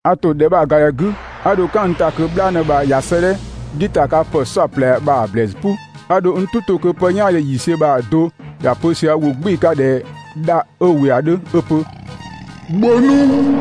A ‑to ‑dhɛ bha‑ ‑ga ‑dhɛ 'gü, 'a dho "kan n ‑ta kö "bhlaanë bha ꞊ya 'sëëdhɛ "dhiʋ̈ ‑ta 'ka ‑pë "saɔplɛ bha‑ ‑blɛɛsü "pʋ. 'A dho n "tʋ 'to kö pë "yaandhe ‑yiisiö bha‑ do ‑ya pö sië ‑wʋ "gbɩɩ‑ 'ka ꞊dhɛ dha 'ö ‑wɩ ‑a 'dhö 'ö‑ pö: «‑Bhö nu!»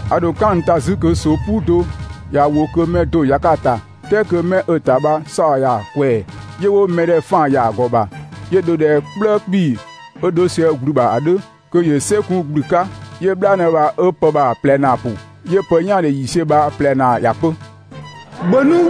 'A dho "kan n ‑ta 'zü kö ꞊soo "puu do ꞊ya ‑wo, kö mɛ do ‑ya ‑ta, "kɛɛ kö 'mɛ 'ö‑ ‑ta bha 'saɔ‑ ‑ya ꞊kwɛɛ‑, 'yö 'wo mɛ ‑dhɛ 'faan‑ ‑ya ‑a ‑gɔ ‑bha, 'yö dho ꞊dhɛ "kplëë 'kpii‑ 'ö 'dho sië ‑gblü ‑bha ‑a 'dhö, kö ‑yö "sɛ kun ‑gblü 'ka. 'Yö "bhlaanë bha 'ö 'pë bha‑ ꞊plɛ ‑naa ‑pʋ. 'Yö pë "yaandhe ‑yiisiö bha‑ ꞊plɛ ‑naa ‑ya pö: «‑Bhö nu!»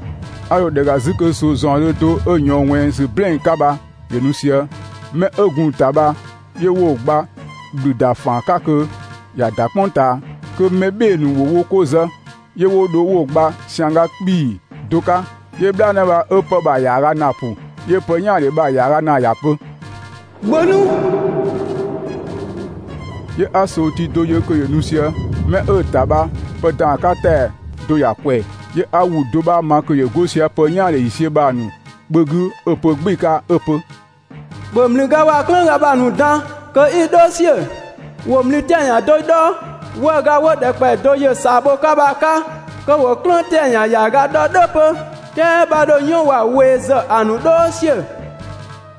'A dho ‑dhɛ ‑ga 'zü kö ꞊soo ‑zaɔndhö do 'ö ꞊yɔɔn ꞊wɛnng ‑sü "blɛɛn‑ 'ka bha ‑yö nu sië. 'Mɛ 'ö gun‑ ‑ta bha 'yö 'wo‑ gba ‑gblü ‑da ‑faan 'ka kö ‑ya ‑da "kpʋng ꞊taa, kö mɛ "bhɩɩ‑ ‑nu ‑wo wo 'ko zë. 'Yö 'wo dho 'wo‑ gba ‑siangga 'kpii‑ do 'ka. 'Yö "bhlaanë bha 'ö 'pë bha‑ ‑yaaga ‑naa ‑pʋ, 'yö pë "yaandhe bha‑ ‑yaaga ‑naa ‑ya pö: «‑Bhö nu!» 'Yö 'a ꞊soo tii do yö kö ‑yö nu sië. Kö 'mɛ 'ö‑ ‑ta bha pë ‑dan 'ka ‑tɛa do ‑ya ꞊kwɛɛ‑. 'Yö 'a ‑wʋ do 'bha ma kö ‑yö 'go sië pë "yaandhe ‑yiisiö bha‑ ‑nu kpö 'gü 'ö‑ pö "gbɩɩ‑ 'ka 'ö‑ pö: «‑Bhö ‑mlüga waa‑ "klëënga bha‑ ‑nu dan kö 'i‑ "dhɔɔ ‑siö. ‑Wo ‑mlü 'tɛa‑ ‑yan do 'dhɔ 'wëëga 'wo ‑dhɛkpaɔyi do ‑yë ꞊saa bho‑ 'ka bha‑ 'ka, kö ‑wo "klëën 'tɛa‑ ‑yan ‑yaaga 'dhɔ "dhʋ̈ 'pö, "kɛɛ 'bha 'dho "yɔn waa‑ we ‑zë ‑a ‑nu "dhɔɔ ‑siö.»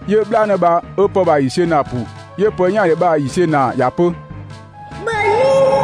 'Yö "bhlaanë bha 'ö 'pë bha‑ ‑yiisiö ‑naa ‑pʋ. 'Yö pë "yaandhe bha‑ ‑yiisiö ‑naa ‑ya pö: «‑Bhö nu!»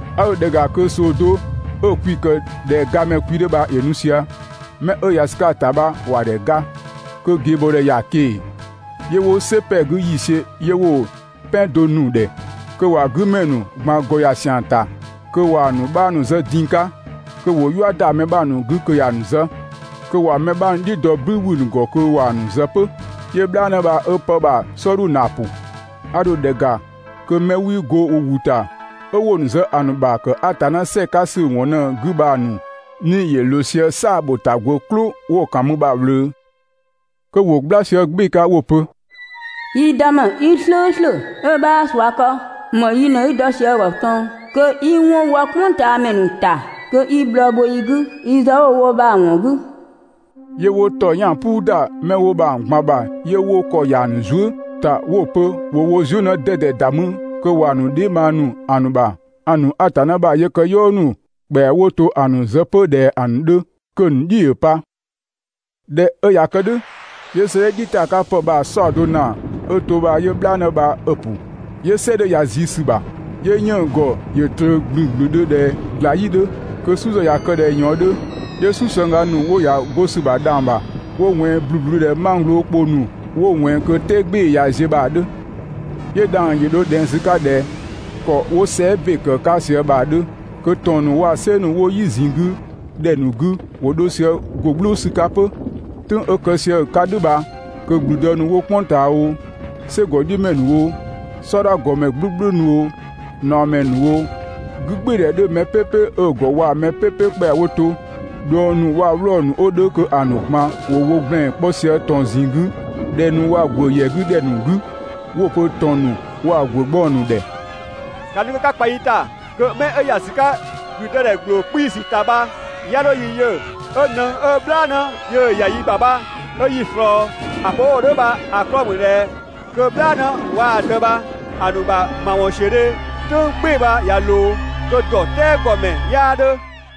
'A dho ‑dhɛ ‑ga kö ꞊soo do 'ö‑ kwi‑ ‑kë ꞊dhɛ gamɛ kwi 'dhö bha ‑yö nu sië, 'mɛ 'ö ‑ya ‑sü 'ka‑ ‑ta bha ‑wa ‑dhɛ ‑ga, kö ꞊geebɔɔdhɛ ‑ya ꞊keng‑. 'Yö 'wo "sɛ ‑pɛ 'gü ‑yiisiö, 'yö 'wo‑ "pɛn do nu‑ ‑dhɛ, kö ‑wa 'gü ‑mɛ ‑nu ꞊gban ‑gɔ ‑ya ‑siang ‑ta, kö ‑wa mɛ 'bha ‑nu zë din‑ 'ka, kö ‑wo "yua ‑da mɛ 'bha ‑nu 'gü kö ‑ya ‑nu zë, kö ‑wa mɛ 'bha ‑nu "dhiʋ̈ dɔ "bü ‑wü ‑nu ‑gɔ kö ‑wa ‑nu zë 'pö. 'Yö "bhlaanë bha 'ö 'pë bha‑ "sɔɔdhu ‑naa ‑pʋ. 'A dho ‑dhɛ ‑ga kö 'mɛ 'wii 'go wo ‑wʋ ‑ta, 'ö 'wo‑ ‑nu zë ‑a ‑nu ‑bha ‑kë Atanna "sɛɛ‑ 'ka ‑sü ‑wɔn ꞊në‑ 'gü bha‑ ‑nu 'nii‑ ‑yö ꞊loo sië "saa‑ ‑bho ‑ta ‑gwë "klʋ 'wo‑ ‑kan mü bha‑ ꞊wlöö. Kö ‑wo "gbla sië "gbɩɩ‑ 'ka 'wo‑ pö: «Yi Dëmɛ 'i "slʋ̈ʋ̈slʋ̈ 'ö 'bhaa ꞊sua kë, ‑më yi ꞊në 'i dɔ sië‑ ‑gɔ ꞊tɔn kö 'i 'wɔn wɔ "kpʋngtaamɛ ‑nu ‑ta, kö 'i bhlɔɔ bho yi 'gü yi zë 'wo‑ wo bha‑ ‑wɔn 'gü?» 'Yö 'wo ‑tɔyang "puu ‑da 'mɛ 'wo bha‑ ꞊gban ‑bha 'yö 'wo ‑kɔ ‑ya ‑nu zuë" ‑ta 'wo‑ pö ‑wo wo zuë" 'në 'dɛdɛ ‑da mü kö ‑wa ‑nu dheebhang ‑nu, ‑a ‑nu Atanna ‑bha yëkëyɔɔ ‑nu ‑kpɛa 'wo to ‑a ‑nu zë 'pö ꞊dhɛ‑ ‑nu 'dhö, kö‑ ‑nu "dhiʋ̈ ‑yö pa. ꞊Dhɛ 'ö ꞊ya kë "dhʋ̈, 'yö 'sëëdhɛ "dhiʋ̈ ‑ta 'ka ‑pë bha‑ "saɔdo ‑naa 'ö to bha 'yö "bhlaanë bha 'ö‑ ‑pʋ. 'Yö "sɛ 'dhö ‑ya ꞊zii ‑sü ‑bha, 'yö 'yënng‑ ‑gɔ ‑yö ꞊tröö ‑blünblündhö ꞊dhɛ ꞊gla "yi 'dhö, kö "su ‑zë ꞊ya kë ꞊dhɛ ꞊yɔɔn 'dhö. 'Yö "susëngga ‑nu 'wo ‑ya 'go ‑sü ‑bha dhang‑ ‑bha 'wo ꞊wɛnng ‑blubludhö ꞊dhɛ mangglo ‑kpo ‑nu 'wo ꞊wɛnng kö "tɛɛ "gbɩɩ‑ ꞊ya ziö bha‑ 'dhö. 'Yö dhang‑ ‑yö dho ꞊dhɛng ‑sü 'ka ꞊dhɛ ‑kɔ 'wo sɛɛ" ‑be ‑kë 'ka ꞊sië bha‑ 'dhö, kö ‑tɔn ‑nu waa‑ "sɛ ‑nu 'wo "yi ꞊zinng 'gü ‑dhɛ ‑nu 'gü ‑wo 'dho sië ‑go "gblʋʋ ‑sü 'ka 'pö. "Tʋ̈ng 'ö kë sië‑ 'ka "dhʋ̈ bha kö ‑gblüdë ‑nu 'wo "kpʋng ꞊taa oo, "sɛgɔ "dhiʋ̈ ‑mɛ ‑nu oo, "sɔdha ‑gɔmɛ "gblʋ̈gblʋ̈ ‑nu oo, ꞊naɔmɛ ‑nu oo, 'gügbɩɩdhɛ 'dhö mɛ "pɛpɛ 'ö‑ ‑gɔ waa‑ mɛ "pɛpɛ ‑kpɛa 'wo to, ꞊dhuëng ‑nu, waa‑ 'wlɔɔ‑ ‑nu 'wo 'dhö kö ‑a ‑nu ꞊gban ‑wo wo ‑gblɛn 'kpɔ sië ‑tɔn ꞊zinng 'gü ‑dhɛ ‑nu waa‑ ‑gwë ‑yɛ 'gü ‑dhɛ ‑nu 'gü, 'wo‑ pö ‑tɔn ‑nu waa‑ ‑gwë 'gbɔng ‑nu ‑dhɛ ‑ka nu kö 'ka kpa yi ‑ta kö 'mɛ 'ö ‑ya 'sü 'ka ‑blüdëdhɛ ‑gbloo 'kpiisü ‑ta bha 'ya 'dho yi yö 'ö nëng 'ö "bhlaanë yöö‑ ‑ya yi ‑bha bha 'ö yi ꞊slɔɔ. ‑A pö 'wo‑ wo "dhʋ̈ bha‑ 'klɔɔ‑ ‑mü ꞊dhɛ kö "bhlaanë waa‑ Dë bha‑ ‑nu ‑bha ‑mawɔnsiödhe "tʋ̈ng "gbɩɩ‑ bha ꞊ya ꞊loo, kö ‑dɔ "tɛɛ ‑gɔ ‑mɛ 'yaa 'dhö.